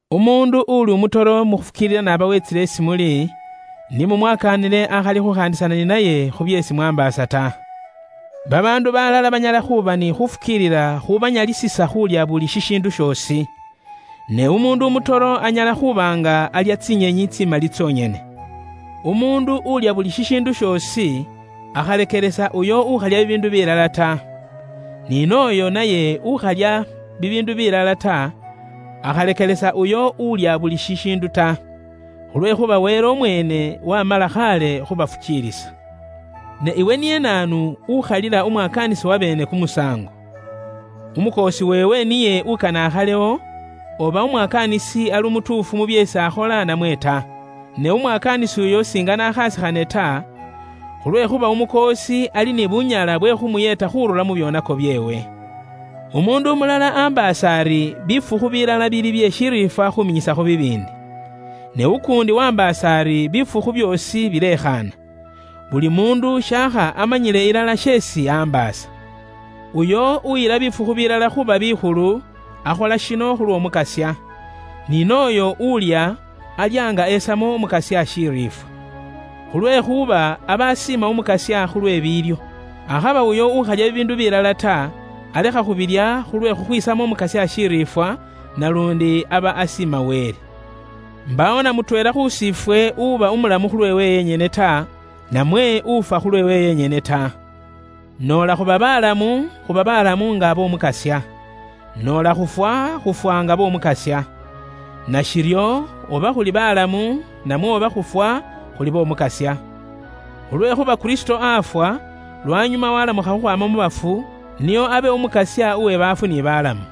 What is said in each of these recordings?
Umuundu uuli umutoro mu khufukiilila n'aba weetsile isi muli, ni mumwakaanile akhali khukhaandisana ni naye khu byeesi mwaambaasa ta. Babaandu balala banyala khuuba ni khufukiilila khubanyalisisa khuulya buli shishiindu shoosi. Ne umuundu umutoro anyala khuuba nga alya tsinyenyi tsimali tsonyene. Umuundu uulya buli shishiindu shoosi, akhalekelesa uyo ukhalya bibiindu bilala ta. Ni nooyo naye ukhalya bibiindu bilala ta, akhalekelesa uyo ulya buli shishiindu ta. Khulwekhuuba Wele umweene wamala khaale khubafukiilisa. Ne iwe niye naanu ukhalila umwakaanisi wabeene kumusaango? Umukoosi weewe niye ukane akhalewo, oba umwakaanisi ali umutuufu mu byeesi akhola namwe ta. Ne umwakaanisi uyo singane akhaasikhane ta, khulwekhuuba Umukoosi ali ni bunyala bwe khuumuyeeta khuurura mu byoonako byeewe. Umuundu umulala ambaasa ari bifukhu bilala bili bye shiriifwa khuuminyisakho bibiindi. Ne ukuundi waambaasa ari bifukhu byoosi bilekhaana. Buli muundu shaakha amanyile ilala sheesi ambaasa. Uyo uyila bifukhu bilala khuuba bikhulu, akhola shino khulw'Omukasya. Ni n'oyo ulya, alya nga esamo Umukasya shiriifwa. Khulwekhuuba aba aasiima Umukasya khulwe biilyo. Akhaba uyo ukhalya bibiindu bilala ta, alekha khubilya khulwe khukhwisamo Umukasya shiriifwa, naluundi aba aasiima Wele. Imbaawo na mutweela khusi ifwe uba umulamu khulweewe yenyene ta, namwe ufwa khulweewe yenyene ta. Noola khuba balamu, khuba balamu nga b'Omukasya. Noola khufwa, khufwa nga b'Omukasya. Nashiryo, oba khuli balamu, namwe oba khufwa, khuli b'Omukasya. Khulwekhuuba Kristo afwa, lwanyuma walamukha khukhwaama mu bafu, nio abe Umukasya uwe baafu ni balamu.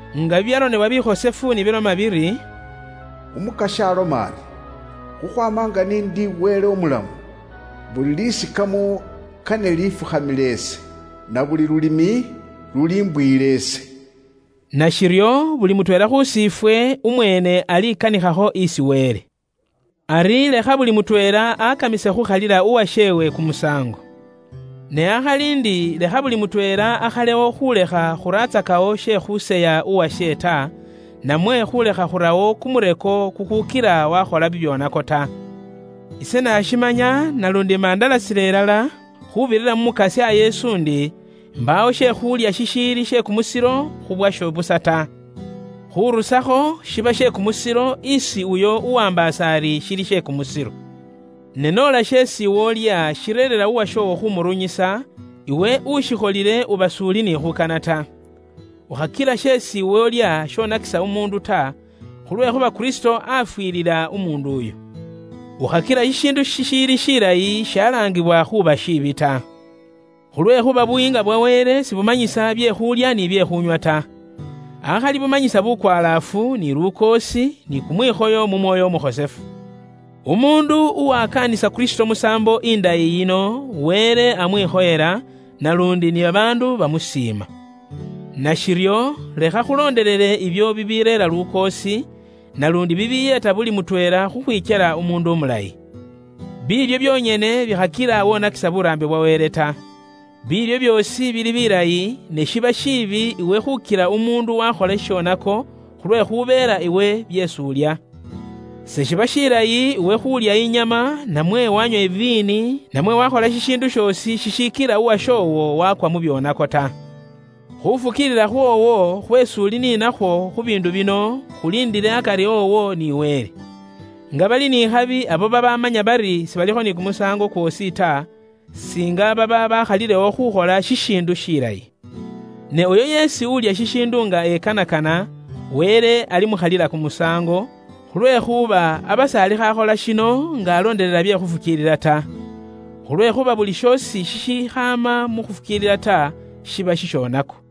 Nga bibyaronebwa bikhosefu ni biloma biri, “Umukasya aloma ari, khukhwaama nga ni indi Wele umulamu, buli lisikamo kane lifukhamile ise, na buli lulimi lulimbuyila ise.” Nashiryo buli mutweela khusi ifwe umweene aliikanikhakho isi Wele. Ari lekha buli mutweela akamise khuukhalila uwasheewe kumusaango. Ne akhali ndi lekha buli mutweela akhalewo khuulekha khuratsakawo she khuuseya uwashe ta, namwe khuulekha khurawo kumureko kukuukila waakhola bibyoonako ta. Ise naashimanya naluundi imandalasila ilala, khuubirira mu Mukasya Yesu ndi, imbaawo she khulya shishiili she kumusilo khu bwasho busa ta. Khurusakho shiba she kumusilo isi uyo uwaambaasa ari shili she kumusilo. Ne noola sheesi iwe ulya shireerera umufukiilisi uwashoowo khumurunyisa, iwe ushikholile uba s'uli ni khuukana ta. Ukhakila sheesi iwe ulya shonakisa umuundu ta, khulwekhuuba Kristo afwilila umuundu uyo. Ukhakila shishiindu shishiili shilayi shalaangibwa khuuba shiibi ta. Khulwekhuuba Buyiinga bwa Wele si buwaamba busa khu bye khuulya ni bye khuunywa ta. Akhali bumanyisa bukwalaafu, ni lukoosi ni kumwikhoyo kweesi Mwoyo Umukhosefu areera. Umuundu uwakaanisa Kristo musaambo indayi yino, Wele amwikhoyela, naluundi ni babaandu bamusiima. Nashiryo lekha khulondelele ibyo bibiireera lukoosi, naluundi bibiiyeeta buli mutweela khukhwikyela umuundu umulayi. Biilyo byonyene bikhakila wonakisa buraambi bwa Wele ta. Biilyo byoosi bili bilayi, ne shiba shiibi iwe khukila umuundu wakhola shishonako, khulwekhubeela iwe byeesi ulya. Se shiba shilayi iwe khuulya inyama, namwe wanywa iviini, namwe wakhola shishiindu shoosi shishikila umufukiilisi uwashoowo wakwa mu byoonako ta. Khuufukiilila khwoowo khweesi uli ni nakhwo khu biindu bino, khuliindile akari owo ni Wele. Nga bali ni khabi abo babamanya bari sibalikho ni kumusaango kwoosi ta, singa baba bakhalilewo khukhola shishiindu shilayi. Ne uyo yeesi ulya shishiindu nga ekanakana, Wele ali mukhalila kumusaango, khulwekhuuba aba s'alikho akhola shino nga alondelela bye khufukiilila ta. Khulwekhuuba buli shoosi shishikhaama mu khufukiilila ta, shiba shishonako.